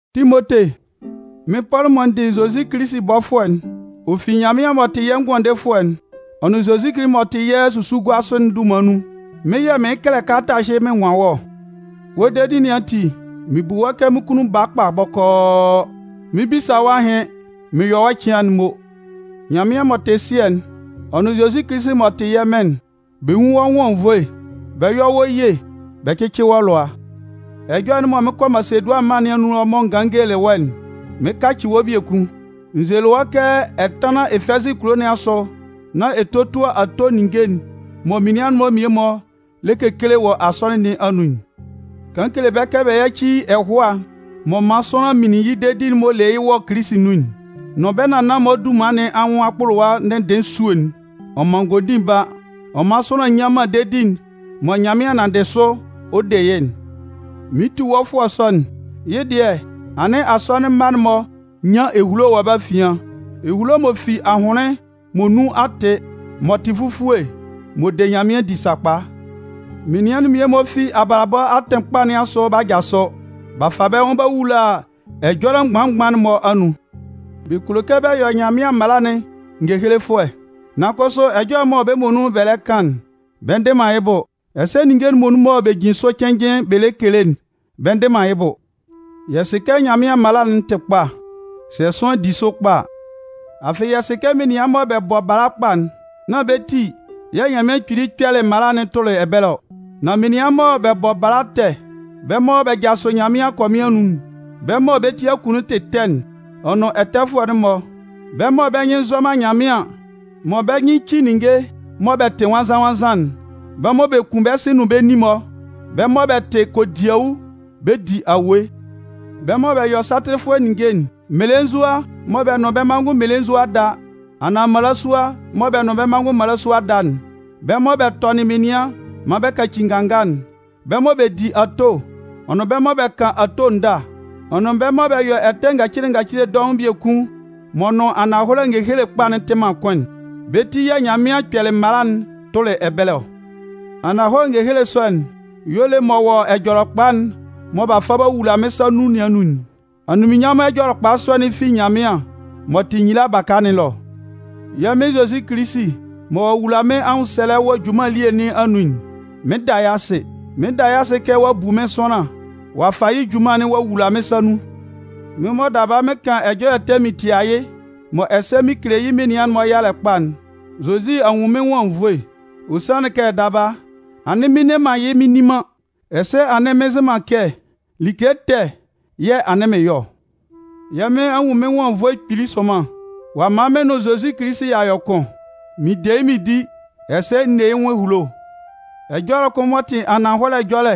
Timote, Mɩn Pɔlʋ mɔ n dɩ Kilisi Zozi bɔfʋɛ'n, ɔ fi Nyanmɩan m'ɔ tɩ yɛ́ Ngʋandefʋɛ'n, ɔ nʋn Zozi Kilisi m'ɔ tɩ yɛ́ susuguasʋ'n dunman nun, mɩ́n yɛ̂ mɩɩn kɛlɛ kalata ɛhɩ mɩn nwan wɔ́ ɔ. Wɔ́ dedi nɩn ati, mɩn bu wɔ́ kɛ mɩ́n kunnun baa kpa bɔkɔɔ. Mɩn 'bisa wɔ́ ahɩn mɩn yɔ wɔ́ ɛcɩan'n mo. Nyanmɩan m'ɔ tɩ Sɩɛ'n, ɔ nʋn Zozi Kilisi m'ɔ tɩ yɛ́ Mɩn'n, bɛ nwún wɔ nwʋn anwunnvoe, bɛ yɔ́ wɔ́ ye, bɛ cɩ́cɩ wɔ́ lʋa. Ɛjɔlɛ'n mɔ mɩn 'kɔ Masedʋanɩn mân nɩn anun mɔ n ganlɩn n gelelɩ wɔ́'n, mɩɩn kacɩ wɔ́ biekun. N zelɩ wɔ́ kɛ ɛ tánlan Efɛzɩ kulo nɩn asʋ nán ɛ tótua ato ninnge'n mɔ menian'n mmie-mɔ lɛ kekele wɔ asɔnɩn nɩn anun'n. Kan kele bɛ́ kɛ bɛ yáci ɛhʋa m'ɔ man sʋanlan minlin yɩ́ dedi m'ɔ le yɩ́ wɔ Kilisi nun'n, nʋn bɛ́ nannan-mɔ dunman nɩn anwʋn akpʋlʋwa ndɩnndɩɩn esue'n. Ɔ man ngondin ba, ɔ man sʋanlan nnyan man dedi'n mɔ Nyanmɩan nanndɩ sʋ ɔ de yɩ́'n. Mɩɩn tu wɔ́ fʋɔ sɔ'n, yɩ́ dɩɛ, anɩn asɔnɩn mma'n-mɔ nyan ehulo wɔ bɛ́ afian, ehulo m'ɔ fi ahʋnlɩn mɔ nun a tɩ, m'ɔ tɩ fufue, mɔ de Nyanmɩan di sakpa. Menian'n mmie-mɔ fi abalabɔ atɩn kpa nɩn asʋ b'a jasʋ b'a fa bɛ́ nwʋn b'a wula ɛjɔlɛ mgban-mgban'n-mɔ anun. Bɛ kulo kɛ bɛ yɔ Nyanmɩan mala'n ngehelefʋɛ, nan kʋsʋ ɛjɔlɛ mɔ bɛ́ muonun bɛ lɛ kan'n, bɛ ndɩ man yɩ́ bʋ, ɛsɛ ninnge'n muonun mɔ bɛ jin sʋ cɩnnjɩn bɛ lɛ kele'n, bɛ ndɩ man yɩ́ bʋ. Yɛ sɩ kɛ Nyanmɩan mala'n tɩ kpa, sɛ sʋanlan di sʋ kpa a. Afɩ yɛ sɩ kɛ menian mɔ bɛ bɔ bala kpa'n, nán bɛ́ ti yɛ̂ Nyanmɩan Kpili kpɛlɩ mala'n tʋlɩ ɛbɛlɛ ɔ. Nan menian mɔ bɛ bɔ bala ɛtɛ'n, bɛ́ mɔ bɛ jasʋ Nyanmɩan akɔmɩn anun'n, bɛ́ mɔ bɛ́ ti akunnun tɩ ɛtɛ'n, ɔ nʋn ɛtɛfʋɛ'n-mɔ, bɛ́ mɔ bɛ́ nyɩn nzɔ Nyanmɩan mɔ bɛ́ nyɩn ci ninnge mɔ bɛ tɩ nwannzan-nwannzan'n, bɛ́ mɔ bɛ kun bɛ́ sɩ nʋn bɛ́ nin-mɔ, bɛ́ mɔ bɛ tɩ kodiawu bɛ di awue, bɛ́ mɔ bɛ yɔ satɩlɩfʋɛ ninnge'n, mmelenzua mɔ bɛ nʋn bɛ́ manngʋn mmelenzua da anaan mmalasua mɔ bɛ nʋn bɛ́ manngʋn mmalasua da'n, bɛ́ mɔ bɛ tɔnɩn menian maan bɛ kaci nganga'n, bɛ́ mɔ bɛ di ato, ɔ nʋn bɛ́ mɔ bɛ kan ato ndâ, ɔ nʋn bɛ́ mɔ bɛ yɔ ɛtɛ ngacile ngacile dɔʋn biekun m'ɔ nʋn ananhɔlɛ ngehele kpa'n tɩ man kʋn'n. Bɛ́ ti yɛ̂ Nyanmɩan kpɛlɩ mala'n tʋlɩ ɛbɛlɛ ɔ. Ananhɔlɛ ngehele sɔ'n y'ɔ le m'ɔ wɔ Ɛjɔlɛkpa'n mɔ b'a fa b'a wula mɩ́n sa nun nɩn anun'n. Anunminnyanmʋn Ɛjɔlɛkpa sɔ'n fi Nyanmɩan m'ɔ tɩ nyila baka nɩn ɛlɔ. Yɛ́ Mɩn Zozi Kilisi mɔ ɔ'a wula mɩ́n anwʋnsɛlɛ wɔ mɩ́n junman elie nɩn anun'n, mɩn 'da yɩ́ asɩ. Mɩn 'da yɩ́ asɩ kɛ ɔ'a bu mɩ́n sʋanlan ɔ'a fa yɩ́ junman'n ɔ'a wula mɩ́n sa nun. Mɩ́n mɔ daba mɩn kan ɛjɔlɛ ɛtɛ mɩn tia yɩ́, mɔ ɛsɛ mɩn kele yɩ́ menian'n-mɔ yalɛ kpa'n, Zozi a nwun mɩ́n nwʋn anwunnvoe. Ɔ sanlɩn kɛ daba, anɩn mɩn nne man yɩ́ mɩn nni man, ɛsɛ anɩn mɩn nzɩ man kɛ like ɛtɛ yɛ̂ anɩn mɩn yɔ ɔ. Yɛ́ Mɩn a nwun mɩ́n nwʋn anwunnvoe kpili sʋnman. Ɔ'a man mɩn nʋn Zozi Kilisi y'a yɔ kʋn, mɩn de yɩ́ mɩn di, ɛsɛ n ne yɩ́ nwʋn ehulo. Ɛjɔlɛ kʋn m'ɔ tɩ ananhɔlɛ ɛjɔlɛ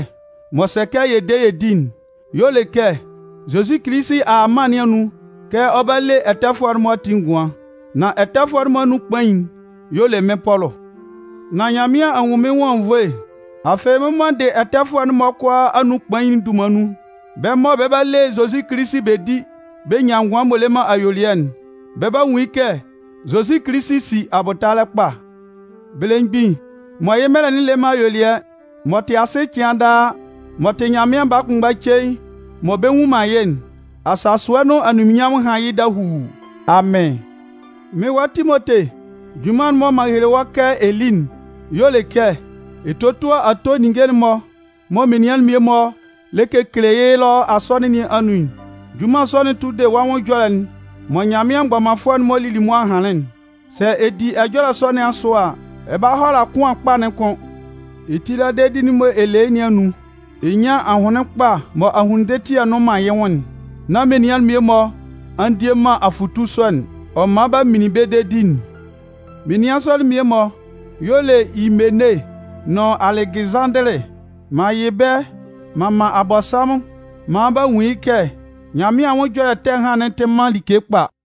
m'ɔ sɛ kɛ yɛ de yɛ di'n y'ɔ le kɛ Zozi Kilisi a a mân nɩn anun kɛ ɔ 'ba le ɛtɛfʋɛ'n-mɔ ati ngʋan. Nan ɛtɛfʋɛ'n-mɔ anun kpain'n y'ɔ le mɩ́n Pɔlʋ. Nan Nyanmɩan a nwun mɩ́n nwʋn anwunnvoe. Afɩ mɩ́n mɔ n dɩ ɛtɛfʋɛ'n-mɔ kʋalaa anun kpain'n dunman nun, bɛ́ mɔ bɛ 'ba le Zozi Kilisi bɛ di bɛ nyan ngʋan m'ɔ le man ayuelɩɛ'n, bɛ 'ba nwun yɩ́ kɛ Zozi Kilisi si abʋtalɛ kpa. Belemgbin mɔ yɩ́ mɛlɛ'n le man ayuelɩɛ, m'ɔ tɩ asɩ cɩan daa m'ɔ tɩ Nyanmɩan baa kʋnmgba cein mɔ bɛ nnwun man yɩ́'n, asasʋɛ nʋn anunminnyanmʋn hán yɩ́ dahuu! Amɩn! Mɩ́n wa Timote, junman'n mɔ m'an hele wɔ́ kɛ ɛ lí'n y'ɔ le kɛ ɛ tótua ato ninnge'n mɔ menian'n mmie-mɔ lɛ kekele yɩ́ ɛlɔ asɔnɩn nɩn anun'n. Junman sɔ'n tʋ de wɔ́ nwʋn ɛjɔlɛ'n mɔ Nyanmɩan mgbɔmanfʋɛ'n-mɔ lili mʋa hanlɩn'n. Sɛ ɛ di ɛjɔlɛ sɔ nɩn asʋ a, ɛ 'ba hʋala kʋan kpa'n kʋn, ɛ tila dedi'n mɔ ɛ le yɩ́ nɩn anun, ɛ nyan ajʋnlɩn kpa mɔ ahunnun ndɩtɩɛ nnʋn man yɩ́ nwʋn'n. Nan menian'n mmie-mɔ a ndie man afʋtu sɔ'n, ɔ man b'a minlin bɛ́ dedi'n. Menian sɔ'n mmie-mɔ y'ɔ le Imene nʋn Alɛgɩzanndɩlɩ. M'an yɩ bɛ́ m'an man Abɔnsanmʋn maan bɛ nwun yɩ́ kɛ Nyanmɩan anwʋn ɛjɔlɛ ɛtɛ ɛhan'n tɩ man like kpa.